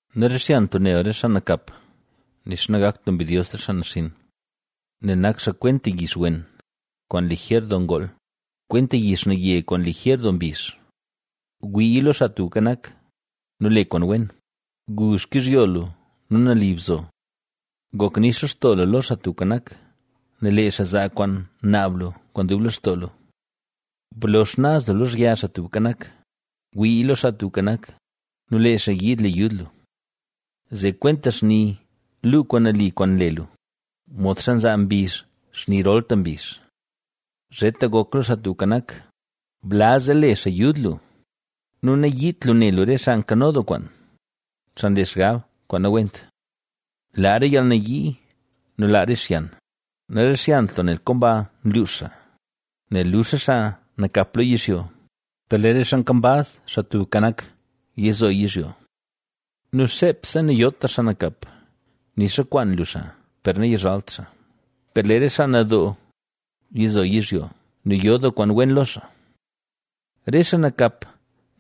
Narixyant lu ne lu re xaa nakap, nixa nagakt lu mbidyos re xaa naxinn, nel nak xaa kwenta yix wen, kwaan lijer doo ngool; kwenta yix naye kwaan lijer doo mbizh. Gwii lo Xaa Tubka Nak, nu le kwaan wen; gu xkizhyo lu nu nali bzo. Gok nix lextoo lu lo Xaa Tubka Nak, nel lee xaa zaa kwaan naab lu kwaan dub lextoo lu. Blo xnaz lu lozhya Xaa Tubka Nak, wii lo Xaa Tubka Nak, nu lee xaa yiid le yud lu. Zee kwenta xni luu kwaan nali kwaan nle lu, modxa nzaa mbizh xni rolta mbizh. Zheta gok lo Xaa Tubka Nak, blaz zee le xaa yud lu nu nayiit lu ne lu re xaa nkano doo kwaan, xaa nle xgab kwaan nawent. Laa re yalnayii nu laa re xyan, narixyant lu nel komba nluux xaa, nel lux re xaa nakap lo yizhyo, per lee re xaa nkambaz Xaa Tubka Nak, yizo yizhyo. Nu xeepse nayotra xaa nakap, nixa kwaan lu xaa, per nayizhalt xaa. Per lee re xaa nadoo yizo yizhyo, nu yo doo kwaan wen lo xaa. Re xaa nakap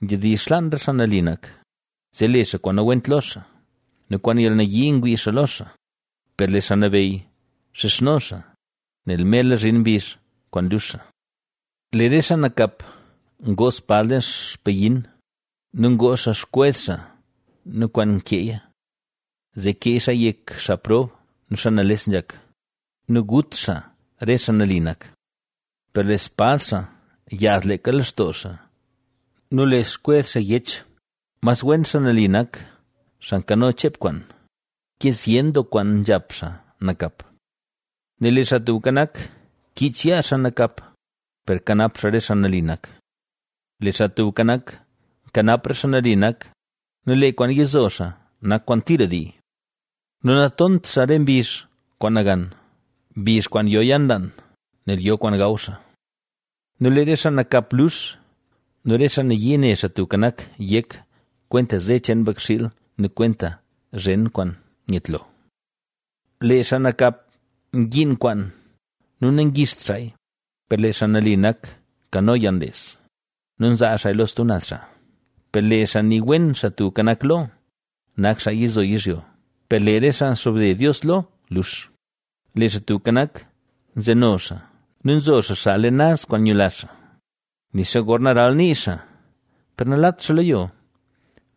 nzhedizh xlaan re xaa nali nak, zee le xaa kwaan nawent lo xaa, nu kwaan yalnayii ngwii xaa lo xaa. Per lee Xaa Nabeyy xizhno xaa, nel merla zhin mbizh kwaan lux xaa. Lee re xaa nakap ngoo spad leen xpayin nu ngoo xaa xkwez xaa nu kwaan nkeeya, zee kee xaaya yek xaa prob nu xaa nales nzhak nu gut xaa re xaa nali nak. Per lee spad xaa yaaz leeka lextoo xaa nu le xkwez xaa yech. Mas wen xaa nali nak, xaa nkano cheep kwaan, ke zyen doo kwaan nzhap xaa nakap. Nel lee Xaa Tubka Nak, kiich yaa xaa nakap, per kanap xaa re xaa nali nak. Lee Xaa Tubka Nak, nkanap re xaa nali nak nu lee kwaan yizo xaa nak kwaan tira dii. Nu natont xaa re mbizh kwaan nagan, mbizh kwaan yo yalnlaan, nel yo kwaan gaw xaa. Nu lee re xaa nakap lux nu re xaa nayii ne Xaa Tubka Nak yek, kwenta ze cheen mbakxiil nu kwenta zhen kwaan nyetlo. Lee xaa nakap ngiin kwaan nu nangixt xaaya, per lee xaa nali nak nkano yalnles nu nzaa xaaya lo stub naz xaa. Per lee xaa nii wen Xaa Tubka Nak lo, nak xaa yizo yizhyo, per lee re xaa nxobde Dios lo, lux. Lee Xaa Tubka Nak nzeno xaa nu nzo xaa xaa leen naz kwaan nyula xaa; nixa gorna ralnii xaa, per nalat xaa lo yo,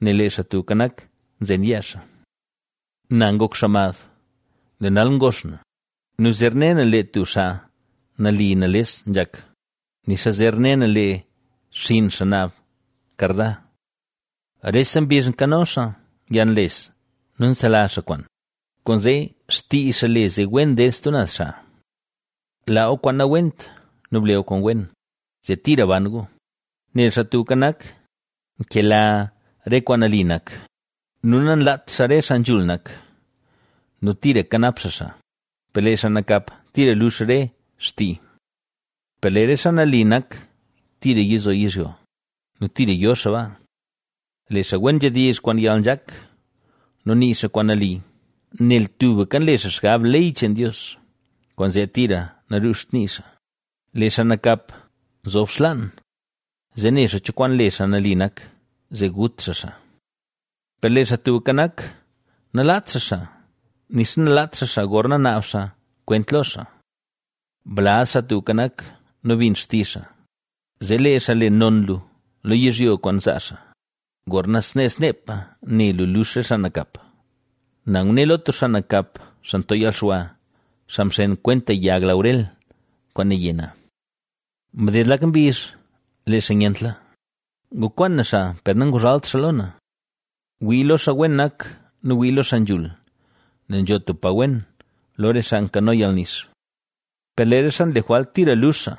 nel lee Xaa Tubka Nak, nzen yaa xaa. Na ngok xaa mad, lee nal ngox na nu zer ne na lee tub xaa nali nales nzhak, nixa zer ne na lee xinn xaa naab karda. Rese mbizh nkano xaa yalnles nu nselazh xaa kwaan, kwaanzee xtii xaa le zee wen ded stub naz xaa. Laa gu kwaan nawent nu ble gu kwaan wen, zee tira ban gu, nel Xaa Tubka Nak, nkela re kwaan nali nak nu nanlaat xaa re xaa nzhul nak nu tira kanap xaa xaa, per lee xaa nakap tira lux re xtii. Per lee re xaa nali nak tira yizo yizhyo nu tira yo xaa baa. Lee xaa wen nzhedizh kwaan yalnzhak, nu nii xaa kwaan nali. Nel tubka nle xaa xgab ley cheen Dios, kwaanzee tira nanruzht nii xaa. Lee xaa nakap nzob xlaan, zee ne xaa cho kwaan le xaa nali nak, zee gut xaa xaa. Per lee Xaa Tubka Nak, nalaat xaa xaa, nixa nalaat xaa xaa gorna naab xaa kwent lo xaa. Blaz Xaa Tubka Nak nu bin xtizh xaa, zee lee xaa le non lu lo yizhyo kwaan zaa xaa. ¡Gorna snee sneepa ne lu lux re xaa nakap! Na ngune lo tub xaa nakap, xaa nto yalxwa, xaa mxen kwenta yag laurel kwaan naye na. Mded lak mbizh lee xaa nyentla, ngukwaan na xaa per nanguzhalt xaa lo na. Gwii lo xaa wen nak nu gwii lo xaa nzhul, nel nzho tub pa wen, lo re xaa nkano yalnix. Per lee re xaa nle jwalt tira lux xaa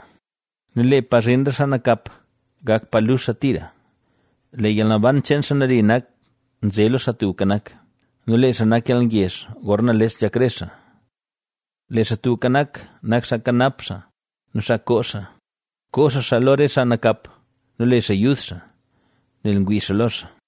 nu lee pa zhin re xaa nakap, gak pa lux xaa tira. Lee yalnaban cheen xaa nali nak nze lo Xaa Tubka Nak nu lee xaa nak yalngezh gorna nales nzhak re xaa. Lee Xaa Tubka Nak, nak xaa kanap xaa nu xaa koo xaa; koo xaa xaa lo re xaa nakap nu le xaa yud xaa, nel ngwii xaa lo xaa.